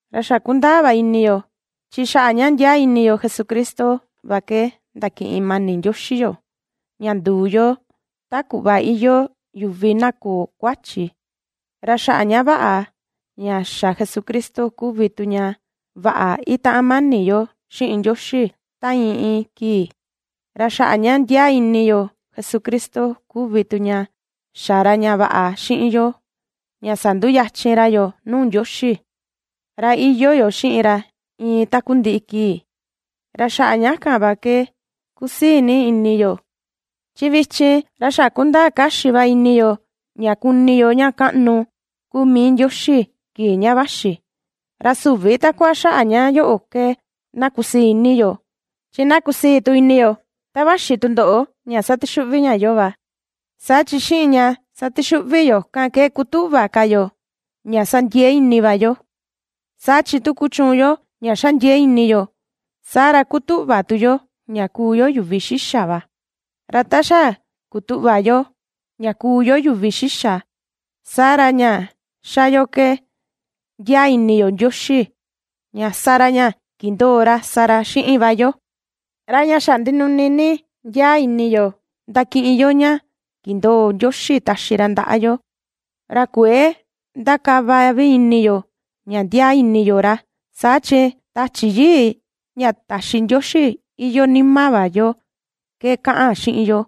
Ra xa kundaa va ini yo, chi xaꞌa ña ndiaa ini yo Jesucristo va ke ndakiꞌin mani Ndioxi yoo ña nduu yo ta kuꞌva iyoo yuvi na köo kuachi, ra xaꞌa ña vaꞌa ña xa Jesucristo kuvi tu ña vaꞌa ^itaꞌan mani yo xiꞌin Ndioxi ta iin iin kii. Ra xaꞌa ña ndiaa ini yo Jesucristo kuvi tu ña xa ra ña vaꞌa xiꞌin yo ña sanduyachin ra yoo nuu Ndioxi, ra iyoo yo xiꞌin ra iin takundiꞌi kii, ra xaꞌa ña kan va ke ^kusii ni ini yo, chi vichin ra kundaa kaxi va ini yo, ña kuni yo ña kaꞌnu kuu mii Ndioxi, kii ña vaxi. Ra süvi takua xaꞌa ña yoꞌo ke na kusii ni ini yo, chi na kusii tu ini yo ta vaxi tundoꞌo ña satixuꞌvi ña yoo va, saa chi xiꞌin ña satixuꞌvi yoo kan ke kutuꞌva ka yo, ña sa ndiee ini va yo. Saa chi tu kuchuun yo ña ^xa ndiee ini yo, saa ra kutuꞌva tu yo ña kuu yo yuvi xixa va, ra ta xa kutuꞌva yo, ña kuu yo yuvi xixa, saa ra ña xa yo ke ndiaa ini yo Ndioxi ña sa ra ña kindoo ra sa ra xiꞌin va yo. Ra ña xa ndinuni ni ndiaa ini yo ndakiꞌin yo ña kindoo Ndioxi taxi ra ndaꞌa yo, ra kuëe ndakava vi ini yo ña ndiaa ini yo ra, saa chi Tachi Yii ña taxi Ndioxi iyoo nima va yo ke kaꞌan xiꞌin yo,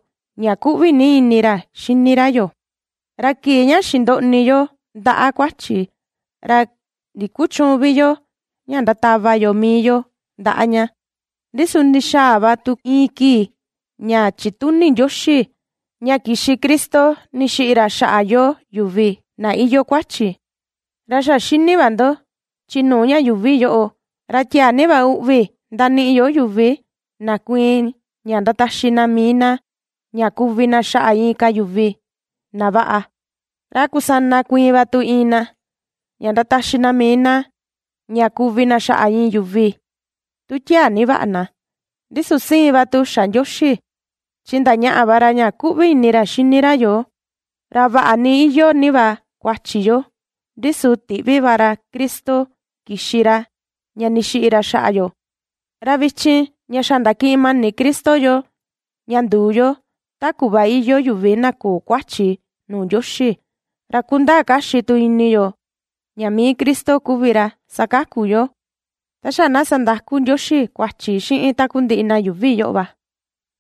ña kuꞌvi ni ini ra xini ra yoo. Ra kii ña xindoꞌni yo ndaꞌa kuachi, ra ndikuchüun vi yo ña ndatava yo mii yo ndaꞌa ña, ndi su ndixaa va tu iin kii ña chituni Ndioxi, ña kixi Cristo ndixiꞌi ra xaꞌa yoo yuvi na iyoo kuachi. Ra xa xini va ndo, chi nuu ña yuuvi yoꞌo, ra tiaa ni va uꞌvi ndaniꞌi yo yuvi na kuiin ña ndataxi na mii na, ña kuvi na xaꞌa inka yuvi na vaꞌa, ra a kusana kuiin va tu iin na, ña ndataxi na mii na, ña kuvi na xaꞌa iin yuvi tu tiaa ni vi vaꞌa na. Ndi su siin va tu xa Ndioxi, chi ndañaꞌa va ra ña kuꞌvi ni ini ra ^xini ra yoo, ra vaꞌa ni iyoo ni va kuachi yo, ndi su tiꞌvi va ra Cristo kixi ra ña ndixiꞌi ra xaꞌa yo. Ra vichin, ña xa ndakiꞌin mani Cristo yoo ña nduu yo, ta kuꞌva iyoo yuvi na köo kuachi nuu Ndioxi, ra kundaa kaxi tu ini yo ña mii Cristo kuvi ra sakaku yoo, ta xa na sandaku Ndioxi kuachi xiꞌin takundiꞌi na yuuvi yoꞌo va.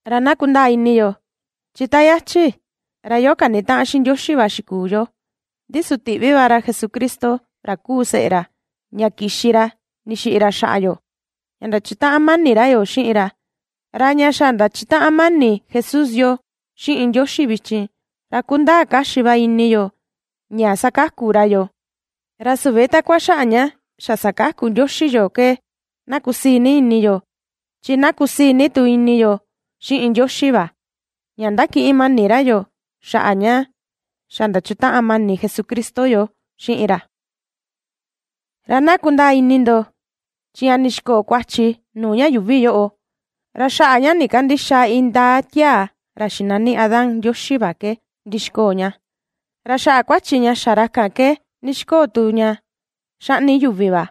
Ra na kundaa ini yo, chi ta yachi, ra yoo kanitaꞌan xiꞌin Ndioxi va xikuu yo, ndi su tiꞌvi va ra Jesucristo ra kuu seꞌe ra, ña kixi ra ndixiꞌi ra xaꞌa yo, ña ndachutaꞌan mani ra yoo xiꞌin ra, ra ña xa ndachutaꞌan mani Jesús yoo xiꞌin Ndioxi vichin, ra kundaa kaxi va ini yo ña sakaku ra yoo. Ra süvi takua xaꞌa ña xa sakaku Ndioxi yoo ke na kusii ni ini yo, chi na kusii ni tu ini yo xiꞌin Ndioxi va, ña ^ndakiꞌin mani ra yoo, xaꞌa ña xa ndachutaꞌan mani Jesucristo yoo xiꞌin ra. Ra na kundaa ini ndo, chi ña ndixikoo kuachi nuu ña yuuvi yoꞌo, ra xaꞌa ña ndikandïxa indaa tiaa ra xinani Adán Ndioxi va ke ndixikoo ña, ra xaꞌa kuachi ña xa ra kan ke ndixikoo tu ña xaꞌni yuvi va.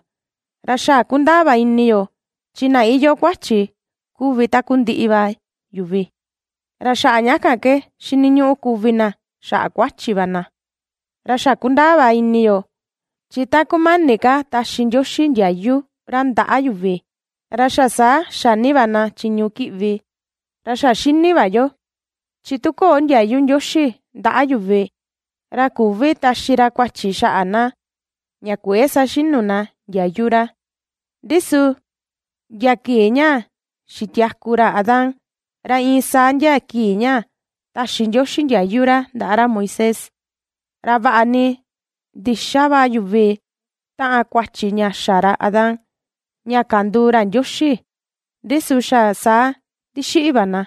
Ra xa kundaa va ini yo, chi na iyoo kuachi kuvi takundiꞌi va yuvi, ra xaꞌa ña kan ke xiniñuꞌu kuvi na xaꞌa kuachi va na. Ra xa kundaa va ini yo, chi ta kumani ka taxi Ndioxi ndiayu ra ndaꞌa yuvi, ra xa saa xa ni va na chiñu kiꞌvi, ra xa xini va yo, chi tu köo ndiayu Ndioxi ndaꞌa yuvi ra küvi taxi ra kuachi xaꞌa na ña kuëe saxinu na ndiayu ra, ndi su ndia kii ña xitiaku ra Adán, ra iin saa ndia kii ña taxi Ndioxi ndiayu ra ndaꞌa ra Moisés, ra vaꞌa ni ndïxa va yuvi taꞌan kuachi ña xa ra Adán ña kanduu ra Ndioxi, ndi su xa saa ndixiꞌi va na.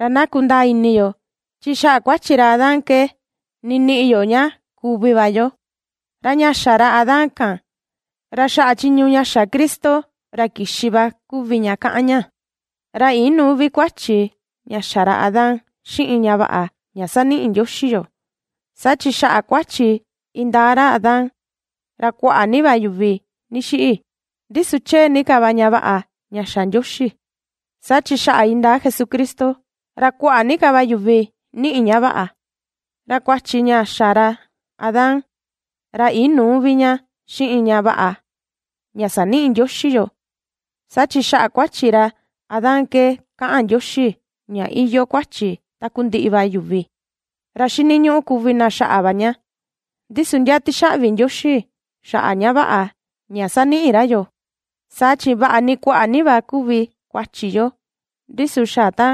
Ra na kundaa ini yo, chi xaꞌa kuachi ra Adán ke niniꞌi yo ña kuvi va yo, ra ña xa ra Adán kan, ra xaꞌa chiñu ña xa Cristo ra kixi va kuvi ña kaꞌan ña. Ra inüu vi kuachi ña xa ra Adán xiꞌin ña vaꞌa ña ^saniꞌi Ndioxi yoo, saa chi xaꞌa kuachi indaa ra Adán, ra kuaꞌa ni va yuvi ndixiꞌi. Ndi su chee ni ka va ña vaꞌa ña xa Ndioxi, saa chi xaꞌa indaa Jesucristo, ra kuaꞌa ni ka va yuvi ^niꞌi ña vaꞌa. Ra kuachi ña xa ra Adán, ra inüu vi ña xiꞌin ña vaꞌa ña saniꞌi Ndioxi yoo, saa chi xaꞌa kuachi ra Adán ke kaꞌan Ndioxi ña iyoo kuachi takundiꞌi va yuvi, ra xiniñuꞌu kuvi na xaꞌa va ña. Ndi su na tixaꞌvi Ndioxi xaꞌa ña vaꞌa ña ^saniꞌi ra yoo, saa chi vaꞌa ni kuaꞌa ni va kuvi kuachi yo, ndi su xa ta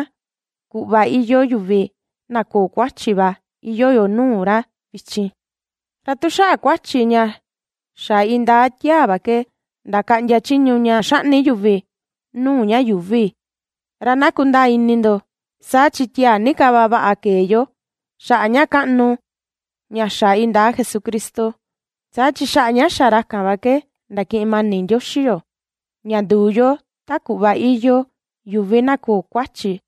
kuꞌva iyoo yuvi na köo kuachi va iyoo yo nuu ra vichin. Ra tu xaꞌa kuachi ña xa indaa tiaa va ke ndakaꞌndia chiñu ña xaꞌni yuvi nuu ña yuuvi. Ra na kundaa ini ndo, saa chi tiaa ni ka va vaꞌa kee yoo, xaꞌa ña kaꞌnu ña xa indaa Jesucristo, saa chi xaꞌa ña xa ra kan va ke ndakiꞌin mani Ndioxi yoo, ña nduu yo ta kuꞌva iyoo yuvi na köo kuachi,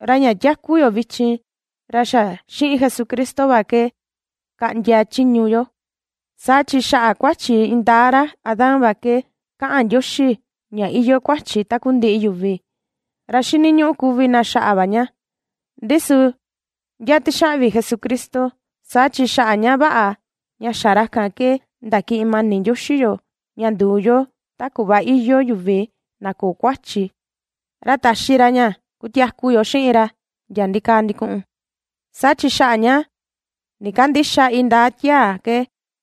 ra ña tiaku yo vichin ra xa xiꞌin Jesucristo va ke kaꞌndia chiñu yo. Saa chi xaꞌa kuachi indaa ra Adán va ke kaꞌan Ndioxi ña iyoo kuachi takundiꞌi yuvi, ra xiniñuꞌu kuvi na xaꞌa va ña, ndi su na tixaꞌvi Jesucristo, saa chi xaꞌa ña vaꞌa ña xa ra kan ke ndakiꞌin mani Ndioxi yoo ña nduu yo ta kuꞌva iyoo yuvi na köo kuachi, ra taxi ra ña kutiaku yo xiꞌin ra ndia ndikaa ndikuꞌun. Saa chi xaꞌa ña ndikandïxa indaa tiaa ke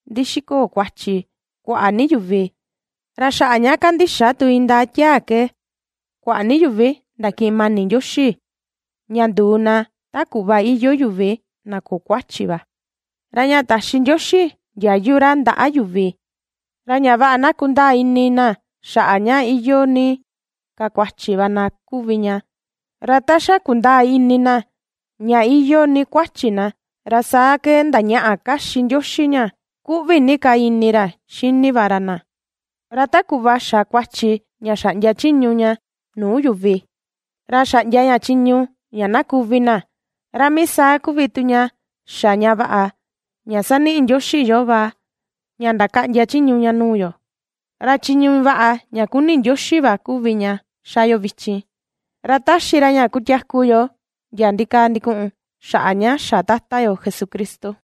ndixikoo kuachi kuaꞌa ni yuvi, ra xaꞌa ña kandixa tu indaa tiaa ke kuaꞌa ni yuvi ndakiꞌin mani Ndioxi ña nduu na, ta kuꞌva iyoo yuvi na köo kuachi va. Ra ña taxi Ndioxi ndiayu ra ndaꞌa yuvi, ra ña vaꞌa na kundaa ini na xaꞌa ña iyoo ni ka kuachi va na kuvi ña. Ra ta xa kundaa ini na ña iyoo ni kuachi na, ra saa ke ndañaꞌa kaxi Ndioxi ña kuꞌvi ni ka ini ra xini va ra na. Ra ta kuꞌva xa kuachi ña xaꞌndia chiñu ña nuu yuvi, ra xaꞌndia ña chiñu ña na kuvi na, ra mii saa kuvi tu ña xa ña vaꞌa ña ^saniꞌi Ndioxi yoo va ña ndakaꞌndia chiñu ña nuu yo, ra chiñu vaꞌa ña kuni Ndioxi va kuvi ña xa yo vichin, ra ^taxi ra ña kutiaku yo ndia ndikaa ndikuꞌun xaꞌa ña xa Tata yo Jesucristo.